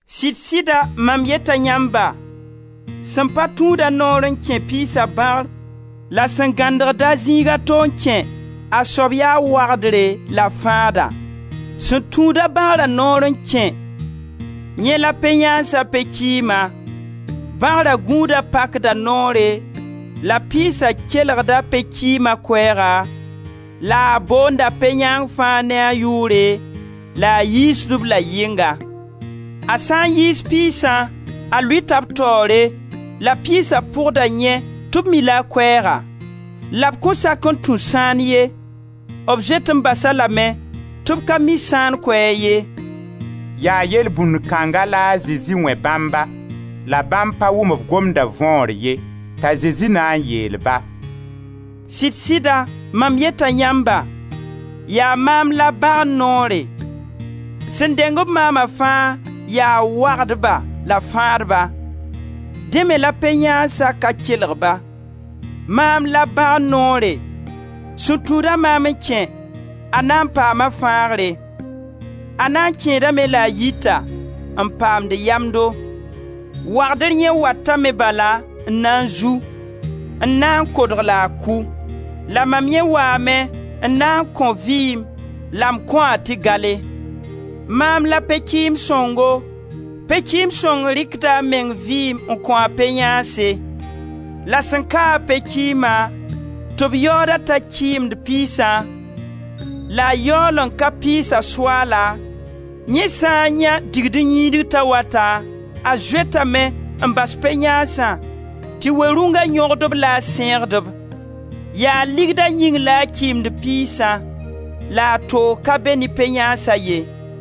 Sɩd-sɩda mam yeta yãmba, sẽn pa tũud-a noor n kẽ piisa bãgr la sẽn gãndgd-a zĩig a to n kẽ, a soab yaa wagdre la fãada. Sẽn tũud-a bãgra noor n kẽ, yẽ la pe-yãansa pe-kɩɩma, Bãgra gũuda pakda noore la piisa kelgda pe-kɩɩma koɛɛga la a boonda pe-yãang fãa ne a yʋʋre la a yiisd-b la yɩnga. A sã n yiis piisã, a lʋɩta b taoore, la piisa pʋgda yẽ tɩ b mi-la a koɛɛga. La b kõn sak n tũ sãan ye, b zoet n bas-a lame, tɩ b ka mi sãan koɛɛg ye.» Yaa yelbũnd kãnga la a Zezi wẽ bãmba, la bãmb pa wʋm b gomda võor ye. T'a Zezi na n le yeel-ba: «Sɩd-sɩda, mam yeta yãmba, yaa maam la bãgr noore. Sẽn deng-b maama fãa yaa wagdba la fãadba; dẽ me la pe-yãansa ka kelg-ba. Maam la bãgr noore, sẽn tũud-a maam n kẽ, a na n paama fãagre; a na n kẽedame la a yita, n paamd yamdo. Wagdr yẽ watame bala n na n zu, n na n kodg la a kʋ. La mam yẽ waame n na n kõ vɩɩm la m kõ-a tɩ gale. Maam la pe-kɩɩm sõngo, pe-kɩɩm sõng rɩkda a meng vɩɩm n kõ a pe-yãanse. La sẽn ka-a pe-kɩɩma, tɩ b yaood-a t'a kɩɩmd piisã la a yaool n ka piisa soaala, yẽ sã n yãe digd-n-yĩid t'a wata, a zoetame n bas pe-yãansã tɩ we-rũnga yõgd-b la a sẽegd-b. Yaa ligda yĩng la a kɩɩmd piisã la a toog ka be ne pe-yãansa ye.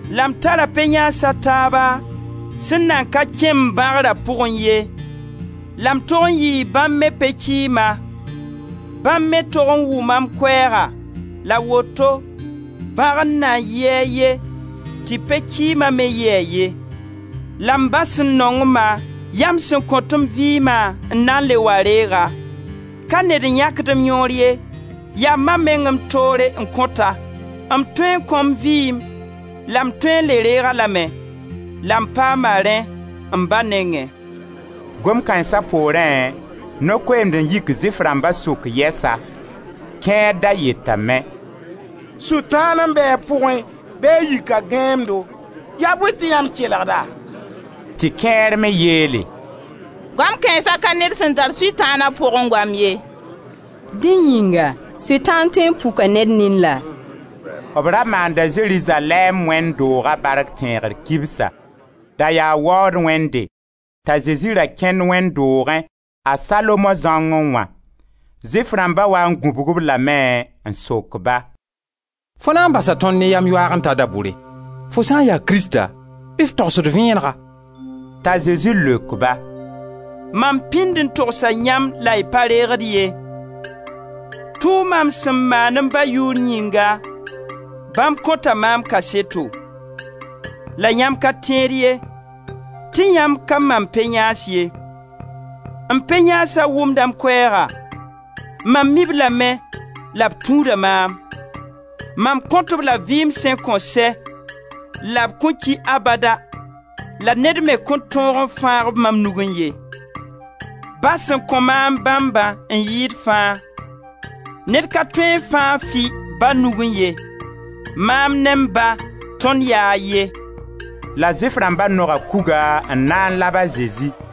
La m tara pe-yãans a taaba sẽn nan ka kẽ m bãgra pʋgẽ ye, la m tog n yɩɩ bãmb me pe-kɩɩma; bãmb me tog n wʋma m koɛɛga, la woto bãgr na yɩ a ye, tɩ pe-kɩɩma me yɩ a ye. La m Ba sẽn nong-ma, yaa m sẽn kõt m vɩɩma n na n le wa reeg-a. Ka ned n yãkd m yõor ye, yaa mam meng m toore n kõt-a. M tõe n kõ m vɩɩm la m tõe n le reeg-a lame; la m paama rẽ m Ba nengẽ.» Gom kãensa, poorẽ no-koeemd n yik Zʋɩf rãmba sʋk yɛsa. Kẽer da yetame: «Sʋtãan n be a pʋgẽ, bɩ a yika gãeemdo. Yaa bõe tɩ yãmb kelgd-a?» Tɩ kẽer me yeele: «Goam kãensa ka ned sẽn tar Sʋtãan a pʋgẽ goam ye. Dẽ yĩnga sʋtãan tõe n puka ned nin laa?» B ra maanda Zerizalɛɛm wẽnd dooga bark tẽegr kibsa. Da yaa waood wẽnde. T'a Zezi ra kẽnd wẽnd doogẽ, a Salomo zãongẽ wã. Zʋɩf rãmba waa n gũbg-b lame n sok ba: «Fo na n basa tõnd ne yam yoaag n ta da-bʋre? Fo sã n ya Krista bɩ f togs-d vẽenega.» T'a Zezi leok-ba: «Mam pĩnd n togsa yãmb la y pa reegd ye. Tʋʋma m sẽn maan m Ba yʋʋr yĩnga, bãmb kõta maam kaseto. La yãmb ka tẽed ye, tɩ yãmb ka mam pe-yãans ye. M pe-yãansa wʋmda m koɛɛga, mam mi-b lame la b tũuda maam. Mam kõt-b la vɩɩm sẽn kõn sɛ la b kõn ki abada la ned me kõn tõog n fãag-b mam nugẽ ye. Ba sẽn kõ maam bãmba n yɩɩd fãa. Ned ka tõe n fãag fɩ Ba nugẽ ye. Maam ne m Ba, tõnd yaa a ye.» La Zʋɩf rãmba noga kuga n na n lab a Zezi.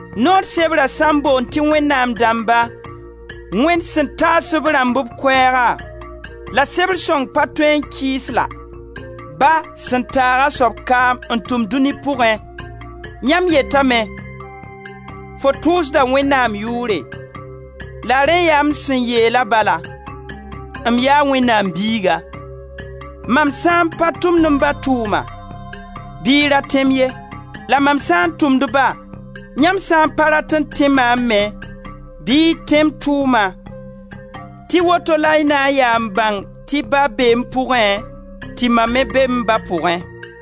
Noor sebra sã n boond tɩ wẽnnaam dãmba, Wẽnd sẽn taas-b rãmb b koɛɛga — la sebr sõng pa tõe n kɩɩs la — Ba sẽn taag a soab kaam n tʋm dũni pʋgẽ, yãmb yetame: ‹Fo tʋʋsda Wẽnnaam yʋʋre,› la rẽ yaa m sẽn yeela bala: ‹M yaa Wẽnnaam Biiga!› Mam sã n pa tʋmd m Ba tʋʋma, bɩ y ra tẽ-m ye. La mam sã n tʋmd-ba, yãmb sã n pa rat n tẽ maam me bɩ y tẽ m tʋʋma tɩ woto la y na n yaa n bãng tɩ Ba bee m pʋgẽ, tɩ mam me be m Ba pʋgẽ.»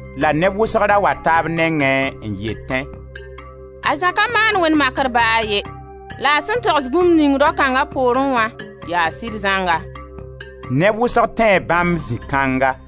La neb wʋsg ra wata b nengẽ n yetẽ: «A Zã ka maan wẽnd makr ba a ye. La a sẽn togs bũmb ning rao kãnga poorẽ wã yaa sɩd zãnga.» Neb wʋsg tẽe bãmb zĩ kãnga.